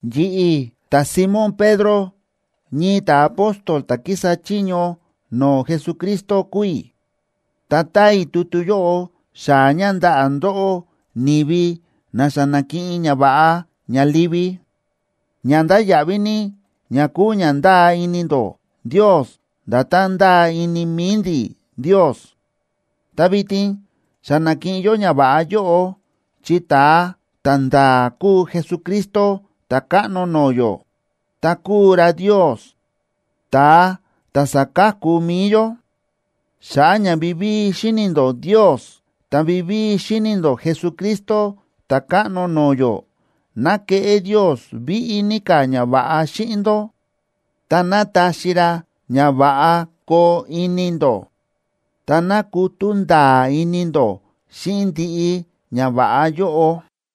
Yi̱ꞌi̱, ta̱Simón Pedro, ñii ta̱apóstol ta̱ kísa chiño no̱o̱ Jesucristo kúu i̱. Ta táa i̱ tutu yóꞌo xaa̱ ña ndaꞌa̱ ndóꞌó, ni̱vi na xa na̱kiꞌin ñava̱ꞌa ña livi, ña ndáya̱ꞌví ní, ña kúu ña ndáa ini ndó Ndios nda̱tán ndáa ini mi̱i ndi̱ Ndios. Ta vitin xa na̱kiꞌin yó ñava̱ꞌa yóꞌo, chi ta̱a ta̱nda̱a̱ kúu Jesucristo, Ta̱káꞌno no̱o̱ yó, ta kúu ra Ndios, ta̱a ta̱ sa̱ka̱ku mi̱i yó. Xa̱ꞌa̱ ña vivíi xíni̱ ndó Ndios ta vivíi xíni̱ ndó Jesucristo Ta̱káꞌno no̱o̱ yó, ná keꞌé Ndios víꞌí ní ka̱ ñava̱ꞌa xíꞌin ndó, ta ná taxi ra ña va̱ꞌa koo ini ndó. Ta ná kutú nda̱a̱ ini ndó xíꞌin ndiꞌi ñava̱ꞌa yóꞌo.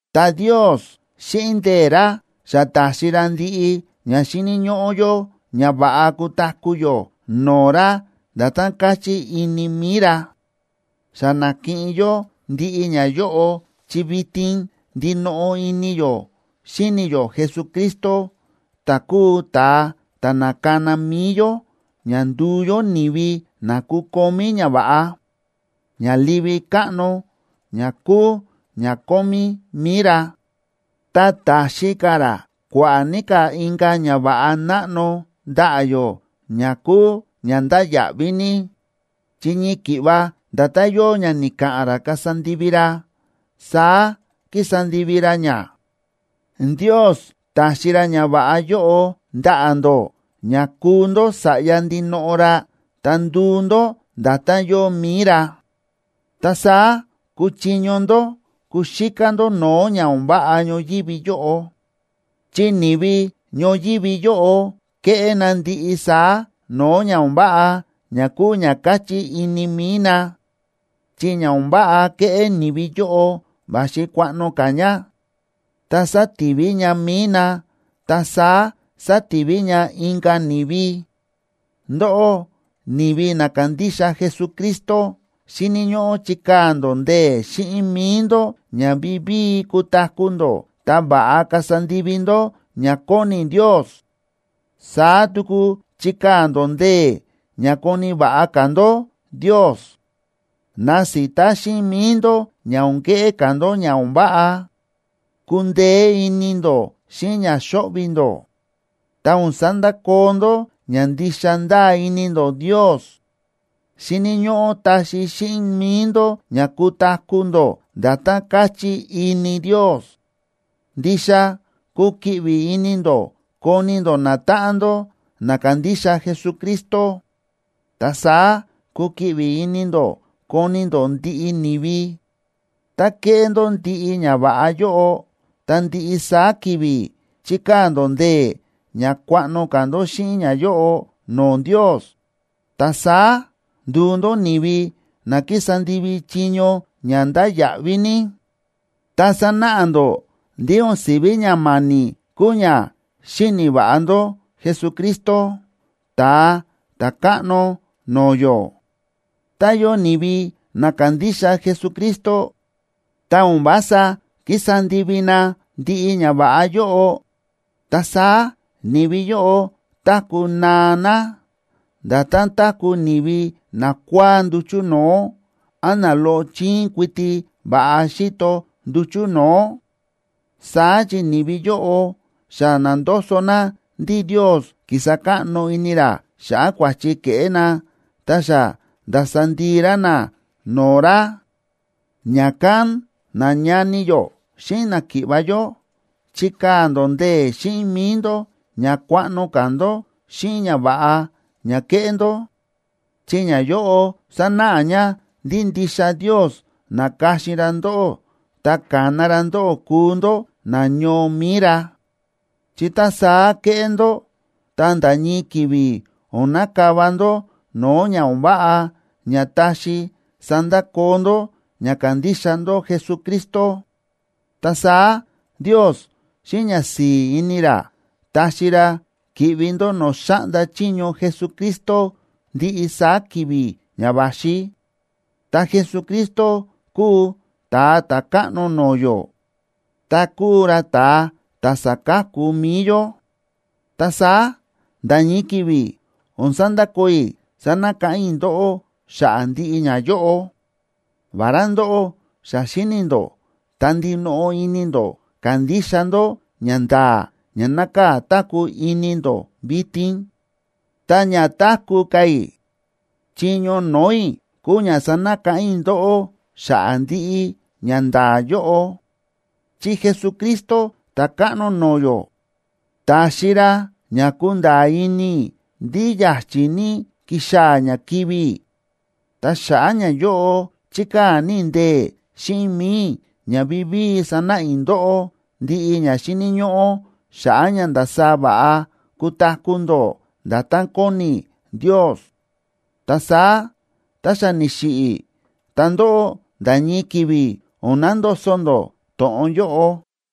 Ta Ndios xíꞌin ndee̱ ra, xa ta̱xi ra ndiꞌi ña xíni̱ ñóꞌó yó ña va̱ꞌa kutaku̱ yó no̱o̱ ra nda̱tán káchí ini mi̱i ra. Xa na̱kiꞌin yó ndiꞌi ñayóꞌo chi vitin ndinoꞌo ini yó xíni̱ yó Jesucristo, ta̱ kúu ta̱a ta̱ na̱kana mi̱i yó ña nduu yó ni̱vi na kukomí ñava̱ꞌa, ña livi káꞌno ña kúu ña kómí mi̱i ra. Ta ta̱xi ka̱ ra kua̱ꞌa̱ ní ka̱ inka̱ ñava̱ꞌa náꞌno ndaꞌa̱ yó, ña kúu ña ndáya̱ꞌví ní, chi ñii ki̱ꞌva nda̱tán yóo ña ni̱ka̱ꞌa̱n ra kasa ndivi ra, saá ki̱sa ndivi ra ña. Ndios ta̱xi ra ñava̱ꞌa yóꞌo ndaꞌa̱ ndó ña kuu ndó sa̱ꞌya ndinoꞌo ra ta nduu ndó nda̱tán yóo mi̱i ra. Ta saá kuchiño ndó kuxíká ndó no̱o̱ ña o̱n váꞌa ñoyívi yóꞌo, chi ni̱vi ñoyívi yóꞌo kéꞌé na ndiꞌi saá no̱o̱ ña o̱n váꞌa ña kúu ña káchí ini mi̱i na. Chi ña o̱n váꞌa kéꞌé ni̱vi yóꞌo va̱xi kuaꞌno ka̱ ña, ta sátivi ña mi̱i na ta saá sativi ña inka̱ ni̱vi. Ndóꞌó ni̱vi na kándixa Jesucristo, xíni̱ ñóꞌó chikaa̱ ndó ndee̱ xíꞌin mi̱i ndó ña vivíi kutaku̱ ndó ta va̱ꞌa kasa ndivi ndó ña kóni Ndios. Saá tuku chikaa̱ ndó ndee̱ ña koni̱ va̱ꞌa ka̱ ndó Ndios. Nasita xíꞌin mi̱i ndó ña o̱n keꞌé ka̱ ndó ña o̱n váꞌa; kundeé ini ndó xíꞌin ña xóꞌvi̱ ndó, ta o̱n sandakoo ndó ña ndixa ndáa ini ndó Ndios. Xíni̱ ñóꞌó taxi xíꞌin mi̱i ndó ña kutaku̱ ndó nda̱tán káchí ini Ndios. Ndixa kukiꞌvi ini ndó koni ndó natáꞌan ndó na kándixa Jesucristo, ta saá kukiꞌvi ini ndó koni ndó ndiꞌi ni̱vi. Tá kéꞌé ndó ndiꞌi ñava̱ꞌa yóꞌo, ta ndiꞌi saá ki̱vi̱ chikaa̱ ndó ndee̱ ña kuaꞌno ka̱ ndó xíꞌin ñayóꞌo no̱o̱ Ndios, ta saá nduu ndó ni̱vi na kísa ndivi chiño ña ndáya̱ꞌví ní, ta sanáꞌa ndó ndí o̱n si̱ví ña ma̱ni̱ kúu ña xíni̱ va̱ꞌa ndó Jesucristo, Ta̱a Ta̱káꞌno no̱o̱ yó. Tá yóo ni̱vi na kándixa Jesucristo, ta o̱n vása kísa ndivi na ndiꞌi ñava̱ꞌa yóꞌo, ta saá ni̱vi yóꞌo táku̱ naa na, nda̱tán táku̱ ni̱vi nakua̱á nduchu̱ no̱o̱, án na loꞌo chíín kuiti va̱ꞌa xíto nduchu̱ no̱o̱. Saá chi ni̱vi yóꞌo xa na̱ndoso na ndí Ndios ki̱sa káꞌno ini ra xa̱ꞌa̱ kua̱chi ke̱ꞌé na ta xa nda̱sa ndii ra na no̱o̱ ra. Ña̱kán, nañani yó xíꞌin náki̱ꞌva̱ yó, chikaa̱ ndó ndee̱ xíꞌin mi̱i ndó ña kuaꞌno ka̱ ndó xíꞌin ñava̱ꞌa ña kéꞌé ndó, chi ñayóꞌo sánáꞌa ña ndí ndixa Ndios na̱ka̱xin ra ndóꞌó ta ka̱na ra ndóꞌó kúu ndó nañoo mi̱i ra. Chi tá saá kéꞌé ndó, ta nda̱ ñii ki̱vi̱ o̱n nakava ndó no̱o̱ ña o̱n váꞌa ña taxi sandakoo ndó ña kándixa ndó Jesucristo. Ta saá Ndios xíꞌin ñasi̱i̱ ini ra taxi ra ki̱ꞌvi ndó no̱o̱ xáꞌnda chiño Jesucristo ndiꞌi saá ki̱vi̱ ña va̱xi. Ta Jesucristo kúu Ta̱a Ta̱káꞌno no̱o̱ yó ta kúu ra ta̱a ta̱ sáka̱ku mi̱i yó. Ta saá nda̱ ñii ki̱vi̱ o̱n sandakoo i̱ sanakáꞌán i̱ ndóꞌó xa̱ꞌa̱ ndiꞌi ñayóꞌo, vará ndóꞌó xa xíni̱ ndó ta ndinoꞌo ini ndó kándixa ndó ñanda̱a̱ ña nákaa̱ táku̱ ini ndó vitin. Tá ña táku̱ ka̱ i̱, chiño no̱o̱ i̱ kúu ña sanakáꞌán i̱ ndóꞌó xa̱ꞌa̱ ndiꞌi ñanda̱a̱ yóꞌo, chi Jesucristo, Ta̱káꞌno no̱o̱ yó, ta̱xi ra ña kúnda̱a̱ ini i̱ ndí ya̱chi̱ ní kixaa̱ ña kivi̱ i̱. Ta xa̱ꞌa̱ ñayóꞌo chíkaa̱ ní i̱ ndee̱ xíꞌin mi̱i i̱ ña vivíi sanáꞌa i̱ ndóꞌó ndiꞌi ña xíni̱ ñóꞌó xa̱ꞌa̱ ña ndasaá va̱ꞌa kutaku̱ ndó nda̱tán kóni Ndios, ta saá tá xa ni̱xiꞌi̱ i̱, ta ndóꞌó nda̱ ñii ki̱vi̱ o̱n nandoso ndó to̱ꞌon yóꞌo.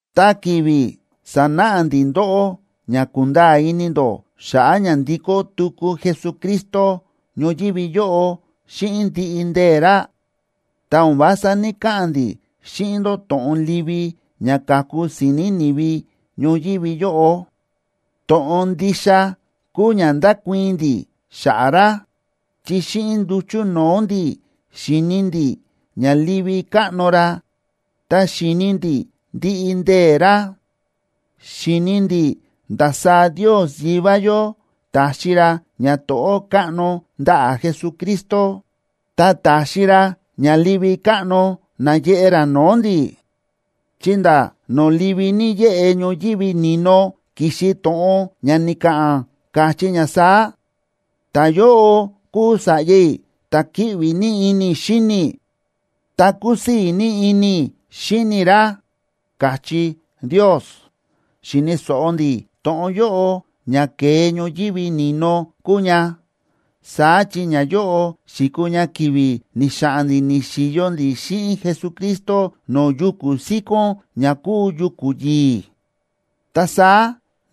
Tá ki̱vi̱ sa̱náꞌa ndi̱ ndóꞌó ña kunda̱a̱ ini ndó xa̱ꞌa̱ ña ndikó tuku Jesucristo ñoyívi yóꞌo xíꞌin ndiꞌi ndee̱ ra, ta o̱n vása ní‑kaꞌa̱n ndi̱ xíꞌin ndó to̱ꞌon livi ña ka̱ku si̱ni̱ ni̱vi ñoyívi yóꞌo. To̱ꞌon ndixa kúu ña ndákuii̱n ndi̱ xa̱ꞌa̱ ra, chi xíꞌin nduchu̱ no̱o̱ ndi̱ xi̱ni ndi̱ ña livi káꞌno ra ta xi̱ni ndi̱ ndiꞌi ndee̱ ra. Xi̱ni ndi̱ ndasaá Ndios Yivá yó ta̱xi ra ñato̱ꞌó káꞌno ndaꞌa̱ Jesucristo, ta ta̱xi ra ña livi káꞌno náyeꞌe ra no̱o̱ ndi̱, chi nda̱ no̱o̱ livi ní yéꞌe ñoyívi ni̱no ki̱xi to̱ꞌon ña ni̱ka̱ꞌa̱n, káchí ña saá: “Ta̱yóꞌo kúu Sa̱ꞌya i̱, ta̱ kíꞌvi ní ini i̱ xíni i̱, ta kúsii̱ ní ini i̱ xíni i̱ ra”, káchí Ndios. Xi̱ni̱ so̱ꞌo ndi̱ to̱ꞌon yóꞌo, ña ke̱e ñoyívi ni̱no kúu ña, saá chi ñayóꞌo xi̱kuu ña ki̱vi̱ ni̱xa̱ꞌa̱n ndi̱ ni̱xi̱yo ndi̱ xíꞌin Jesucristo no̱o̱ yuku̱ síkón ña kúu yuku̱ yi̱i̱. Ta saá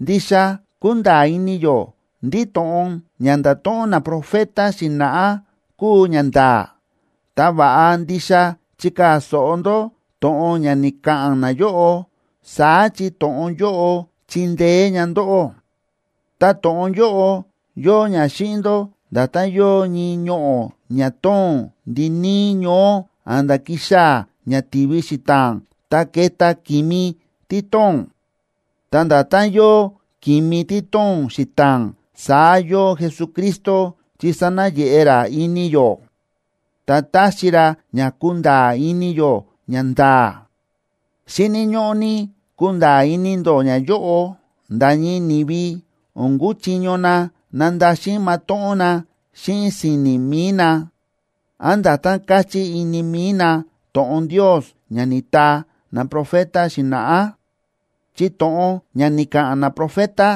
ndixa kúnda̱a̱ ini yó ndí to̱ꞌon ña nda̱to̱ꞌon naprofeta xi̱na̱ꞌá kúu ñanda̱a̱. Ta va̱ꞌa ndixa chikaa̱ so̱ꞌo ndó to̱ꞌon ña ni̱ka̱ꞌa̱n nayóꞌo, saá chi to̱ꞌon yóꞌo chindeé ña ndóꞌó. Ta to̱ꞌon yóꞌo yóo ña xíꞌin ndó nda̱tán yóo ñii ñoꞌo̱ ña tóo̱n ndiníí ñoó a̱nda̱ kixaa̱ ña tivi xita̱a̱n ta keta ki̱mi tí tóo̱n. Ta nda̱tán yóo ki̱mi tí tóo̱n xita̱a̱n, saá yóo Jesucristo, chi sánayeꞌe ra ini yó, ta táxi ra ña kunda̱a̱ ini yó ñanda̱a̱. Xíni̱ ñóꞌó ní kunda̱a̱ ini ndó ñayóꞌo: nda̱ ñii ni̱vi o̱n kúchiño na nandaxin matóꞌón na xíꞌin si̱ni̱ mi̱i na, án nda̱tán káchí ini mi̱i na, to̱ꞌon Ndios ña ni̱taa naprofeta xi̱na̱ꞌá. Chi to̱ꞌon ña ni̱ka̱ꞌa̱n naprofeta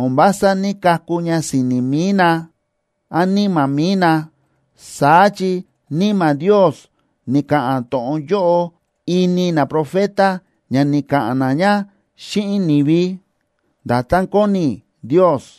o̱n vása ní‑kaku ña si̱ni̱ mi̱i na án níma̱ mi̱i na, saá chi Níma̱ Ndios ni̱ka̱ꞌa̱n to̱ꞌon yóꞌo ini naprofeta ña ni̱ka̱ꞌa̱n na ña xíꞌin ni̱vi, nda̱tán kóni Ndios.